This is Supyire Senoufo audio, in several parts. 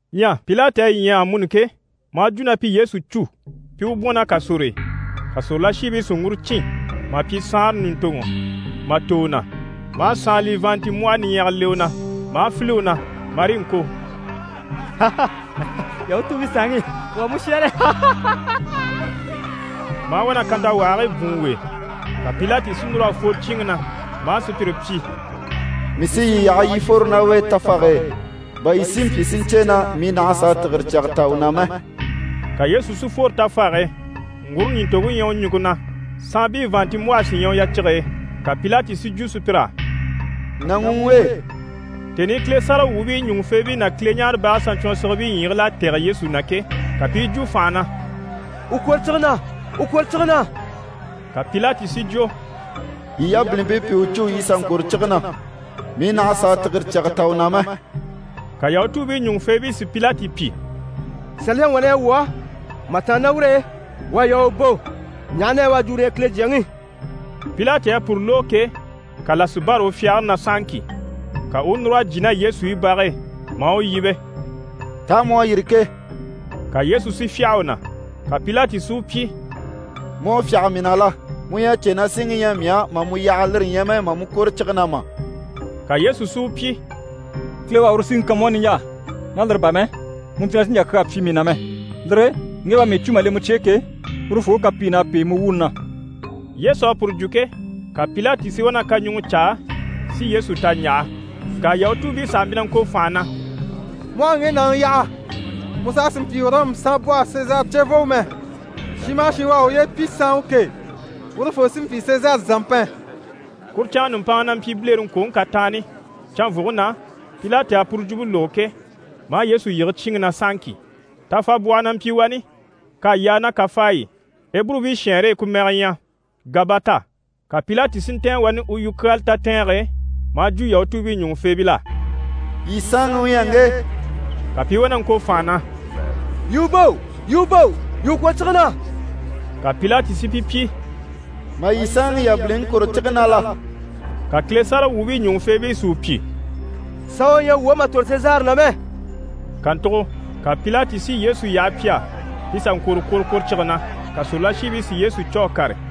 Ɲyɛ Pilati à yi ɲya amuni ke, maa jwo na pi Yesu cû, pi i u bwɔ̀n ná kàsor'e. Ka sòrolashiibii si ŋguro cîn mà pyi saanra ɲùntoŋɔ mà tò u na, maa saanlii vàanntinmbwɔhɔ niɲyɛga le u na. Maa file u na, marii ŋko: «Yahutuubii Saanŋi, wuu à mu shɛ́ɛre!» Maa wá na kantawahigii bwùun u e. Ka Pilati si núr'a fworo cyíinŋi na, maa sùpyire pyi: «Mii sí yii yaha yii fworo ná u e tafage e, bà yii si mpyi si ɲcè na mii nàha a sàa tìgire cyaga ta u na mɛ.» Ka Yesu si fworo tafage e, ŋgure nìntoŋke ɲyɛ u ɲùŋke na, saanbii vàanntinmbwɔhe sí ɲyɛ u yacige e. Ka Pilati si jwo sùpyir'á: «Nàŋi u ŋge.» Tèni i Kile sáragawwuubii ɲùŋufeebii ná Kileɲaarebage saɲcwɔnsigibii ɲyiigil'à tɛ̀gɛ Yesu na ke, ka pi i jwo fànha na: «U kwòro cige na! U kwòro cige na!» Ka Pilati si jwo: «Yii yabilimpii pi u cû, yii sà ŋkwòro cige na, mii nàha a sàa tìgire cyaga ta u na mɛ.» Ka Yahutuubii ɲùŋufeebii si Pilati pyi: «Saliyaŋi wà na ɲyɛ wuu á, mà tàanna ná ur'e, u à yaa u bò, ɲaha na yɛ u à jwo uru u ɲyɛ Kile Jyaŋi.» Pilati à puru lógo ke, ka là si bâra u fyagare na sahaŋki. Ka u u núr'a jyè ná Yesu i bage e, maa u yíbe: «Taa mu à yîri ke?» Ka Yesu si fyâha u na. Ka Pilati si u pyi: «Mu à fyâha mii na la? Mu ɲyɛ a cè na síŋi ɲyɛ mii á mà mu yaha, lire ɲyɛ mɛ mà mu kwòro cige na mà?» Ka Yesu si u pyi: «Kile u à uru síŋi kan mu á niɲjaa. Ná lire bà mɛ, mu mpyi na sì n‑jà kyaa pyi mii na mɛ. Lire e ŋge u à mii cû mà le mu cye e ke, urufoo u kapiin'à pêe mu wuuni na.» Yesu à puru jwo ke, ka Pilati si wá na kaɲuŋɔ caa si Yesu ta ɲjaha. Ŋka Yahutuubii saha mpyi ŋko fànha na: «Mu aha ŋge nàŋi yaha, mu saha sì n‑pyi Ɔrɔmu saanbwɔhe Sezari cevooŋi mɛ. Shin maha shin u à uye pyi saanwa ke, urufoo sí n‑pyi Sezari zàmpɛn.» Kuru canŋke nùmpanŋa na mpyi bilereŋkwoŋi kataanni. Canvwuge na, Pilati à puru jwumpe lógo ke, maa Yesu yige cyíinŋi na sahaŋki. Tafabwɔhɔ na mpyi wani, k'à yaa ná kafaayi i, Eburubii shɛɛnre e ku mɛge ɲyɛ: «Gabata». Ka Pilati si ntɛ̀ɛn wani u yukyaala tatɛɛnge e, maa jwo Yahutuubii ɲùŋufeebil'á: «Yii saanŋi u ɲyɛ ŋge!» Ka pi i wá na ŋko fànha na: «Yii u bò! Yii u bò! Yii u kwòro cige na!» Ka Pilati si pi pyi: «Mà yii saanŋi yabiliŋi kwòro cige na la?» Ka Kile sáragawwuubii ɲùŋufeebii si u pyi: «Saanwa ɲyɛ wuu á mà tòro Sezari na mɛ!» Kàntugo ka Pilati si Yesu yaha pi á pi sà ŋkwòro kworokworocige na. Ka sòrolashiibii si Yesu cû a kàre.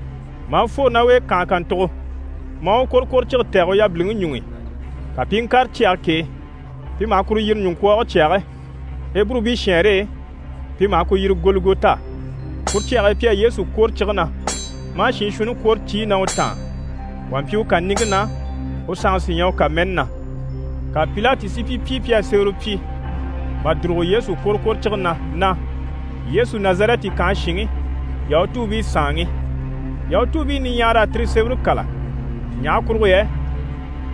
Maa fworo ná u e kànhe kàntugo, maa u kworokworocige tɛ̀gɛ u yabiliŋi ɲuŋ'i. Ka pi i ŋkàre cyage k'e, pi maha kuru yiri: «Ɲuŋkwɔɔge Cyage» Eburubii shɛɛnre e pi maha ku yiri: «Gɔlikota». Kuru cyage e pi à Yesu kwòro cige na, maa shiin shuunni kwòro ciyi na u taan. Wà mpyi u kàniŋke na, u sanŋi sí ɲyɛ u kàmɛni na. Ka Pilati si pi pyi pi à sémɛrɛ pyi mà dùrugo Yesu kworokworocige na na: «YESU NAZARƐTI KANHE SHINŊI, YAHUTUUBII SAANŊI.» Yahutuu niɲyahara à tire sémɛre kâla, ɲaha kurugo yɛ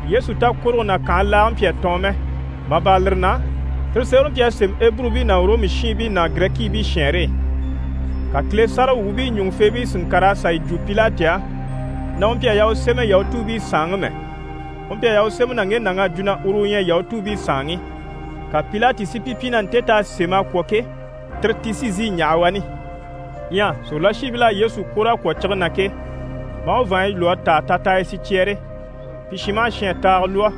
Yesu takworoge ná kànhe laage mpyi a tɔɔn mɛ. Mà bâra lire na, tire sémɛre mpyi a sémɛ Eburubii ná Ɔrɔmu shiinbii ná Girɛkiibii shɛɛnre e. Ka Kile sáragawwuubii ɲùŋufeebii si ŋkàr'a sà yi jwo Pilati á na u mpyi a yaa u sémɛ: «Yahutuubii Saanŋi» mɛ, u mpyi a yaa u sémɛ na ŋge nàŋ'à jwo na uru u ɲyɛ Yahutuubii Saanŋi. Ka Pilati si pi pyi na nte t'à sémɛ a kwɔ̀ ke, tire ti sí n‑sìi n‑yaha wani. Ɲyɛ sòrolashiibil'à Yesu kwòr'a kwɔ̀ cige na ke, maa u vàanɲyi lwɔ́ a táa tataayi sicyɛɛre, pi shin maha shin à taaga lwɔ́,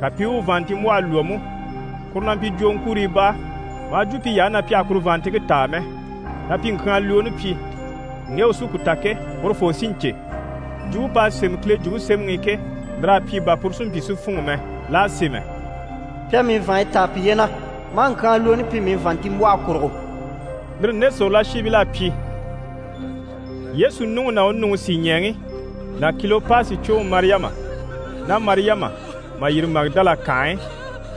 ka pi i u vàanntinmbwɔhe lwɔ́ mú, kuru na mpyi jwòoŋkuriibaa. Maa jwo piy'á na pi àha kuru vàanntinŋke táa mɛ, na pi ŋkyaanlwooni pyi, ŋge u sí ku ta ke, urufoo sí n‑cè. Jwumpe p'à sémɛ Kile Jwumpe Semɛŋi i ke, lir'à pyi bà puru si mpyi si fûnŋɔ mɛ. L'à sémɛ: «Pi à mii vàanɲyi táa piye na, maa ŋkyaanlwooni pyi mii vàanntinmbwɔhe kurugo.» Lire nde sòrolashiibil'à pyi. Yesu nuŋi ná u nuŋi sìɲɛɛŋi ná Kilopasi cwoŋi Mariyama ná Mariyama mà yîri Magidala kànhe e,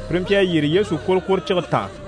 pire mpyi a yyére Yesu kworokworocige taan.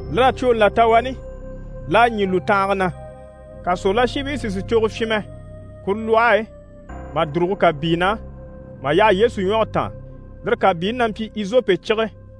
Lir'à cwooni là ta wani, l'à ɲî lùtanhaga na. Ka sòrolashiibii si sìcogo fyinmɛ kuru lwɔhe e mà dùrugo kàbii na, mà yaha Yesu ɲwɔge taan, lire kàbiini na mpyi izope cige.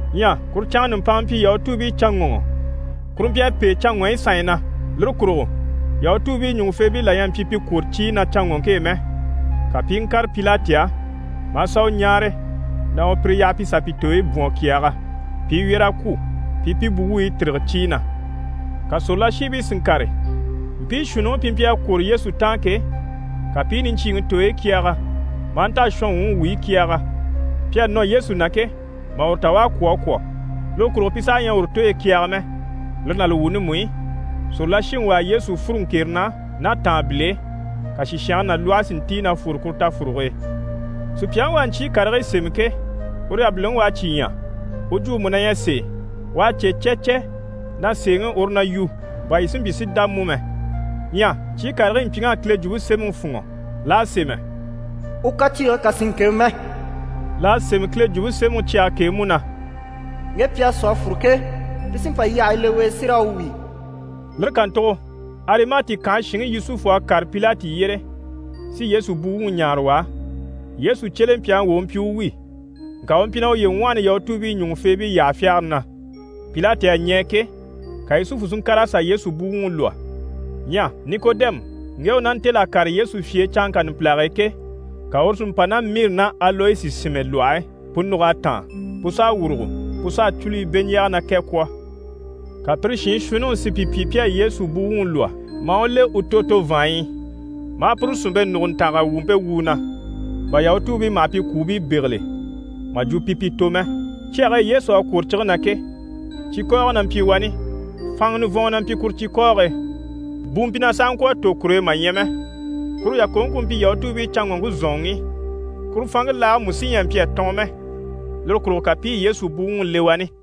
Ɲyɛ kuru canŋke nùmpanŋa mpyi Yahutuubiicanŋɔŋɔ, kuru mpyi a pêe canŋɔɲyi sanɲyi na. Lire kurugo Yahutuubii ɲùŋufeebii la ɲyɛ a mpyi pi kwôro ciyi na canŋɔŋke e mɛ. Ka pi i ŋkàre Pilati á maa sà u ɲáare na u pire yaha pi sà pi tooyi bwɔ̀n a kyɛɛgɛ, pi i wyɛ̀r'a kwû, pi i pi buwuubii tîrige ciyi na. Ka sòrolashiibii si ŋkàre, mpii shuunniŋi pi mpyi a kwòro Yesu taan ke, ka pi i niɲcyiiŋi tooyi kyɛɛgɛ, maa nta a shɔnwuŋi wuyi kyɛɛgɛ. Pi à nɔ Yesu na ke, mà uru ta u à kwû a kwɔ̀. Lire kurugo pi saha ɲyɛ a uru u tooyi kyɛɛgɛ mɛ. Lire ná li wuuni mú i, sòrolashiŋi wà à Yesu sú a fûru ŋkere na ná tàanbil'e. Ka sìshange ná lwɔhe si ntíi na fwore kuru tafuruge e. Sùpyaŋi u à ɲcyii karigii sémɛ ke, uru yabiliŋi u à cyi ɲya, u jwumpe mú na ɲyɛ sèe. U à cè cɛcɛ na sèeŋi uru na yu, bà yii si mpyi si dá mú mɛ. Ɲyɛ ɲcyii karigii mpyiŋ'à Kile Jwumpe Semɛŋi fûnŋɔ. L'à sémɛ: «U kaciige kà sì n-kebe mɛ.» L'à sémɛ Kile Jwumpe Semɛŋi cyage k'e mú na: «Ŋge pi à sú a fûru ke, pi sí n‑pa yyahayi le u e si raa wíi.» Lire kàntugo Arimati kànhe shinŋi Yusufu à kàre Pilati yyére si Yesu buwuŋi ɲáare u á. Yesu cyelempyaŋi wà u mpyi u wi, ŋka u mpyi na uye ŋwɔhɔni Yahutuubii ɲùŋufeebii yyaha fyagare na. Pilati à ɲɛɛ ke, ka Yusufu si ŋkàr'a sà Yesu buwuŋi lwɔ́. Ɲyɛ Nikodɛmu, ŋge u ná ntêl'a kàre Yesu fye e canŋka numpilage e ke, ka uru si mpa ná miri ná aloyesi sìnmɛ lwɔhe e, pu nùg'à táan, pu s'à wùrugo, pu s'à cúluyi beɲjaaga ná kɛ kwɔ̀. Ka pire shiin shuunniŋi si pi pyi pi à Yesu buwuŋi lwɔ́, maa u le u tòto vàanɲyi i, maa puru sìnmpe nùguntanga wumpe wu u na, bà Yahutuubii maha pi kwùubii bégeli mà jwo pi pi tò mɛ. Cyage e Yesu à kwòro cige na ke, cikɔɔgɔ na mpyi wani, fanŋa nivɔnŋɔ na mpyi kuru cikɔɔge e, bu mpyi na sàha ŋkwɔ̀ a tò kur'e mà ɲya mɛ. Kuru yàkoŋke ku mpyi Yahutuubii canŋɔŋke zɔ̀nŋɔŋi. Kuru fanŋke laage mú sí ɲyɛ a mpyi a tɔɔn mɛ, lire kurugo ka pi i Yesu buwuŋi le wani.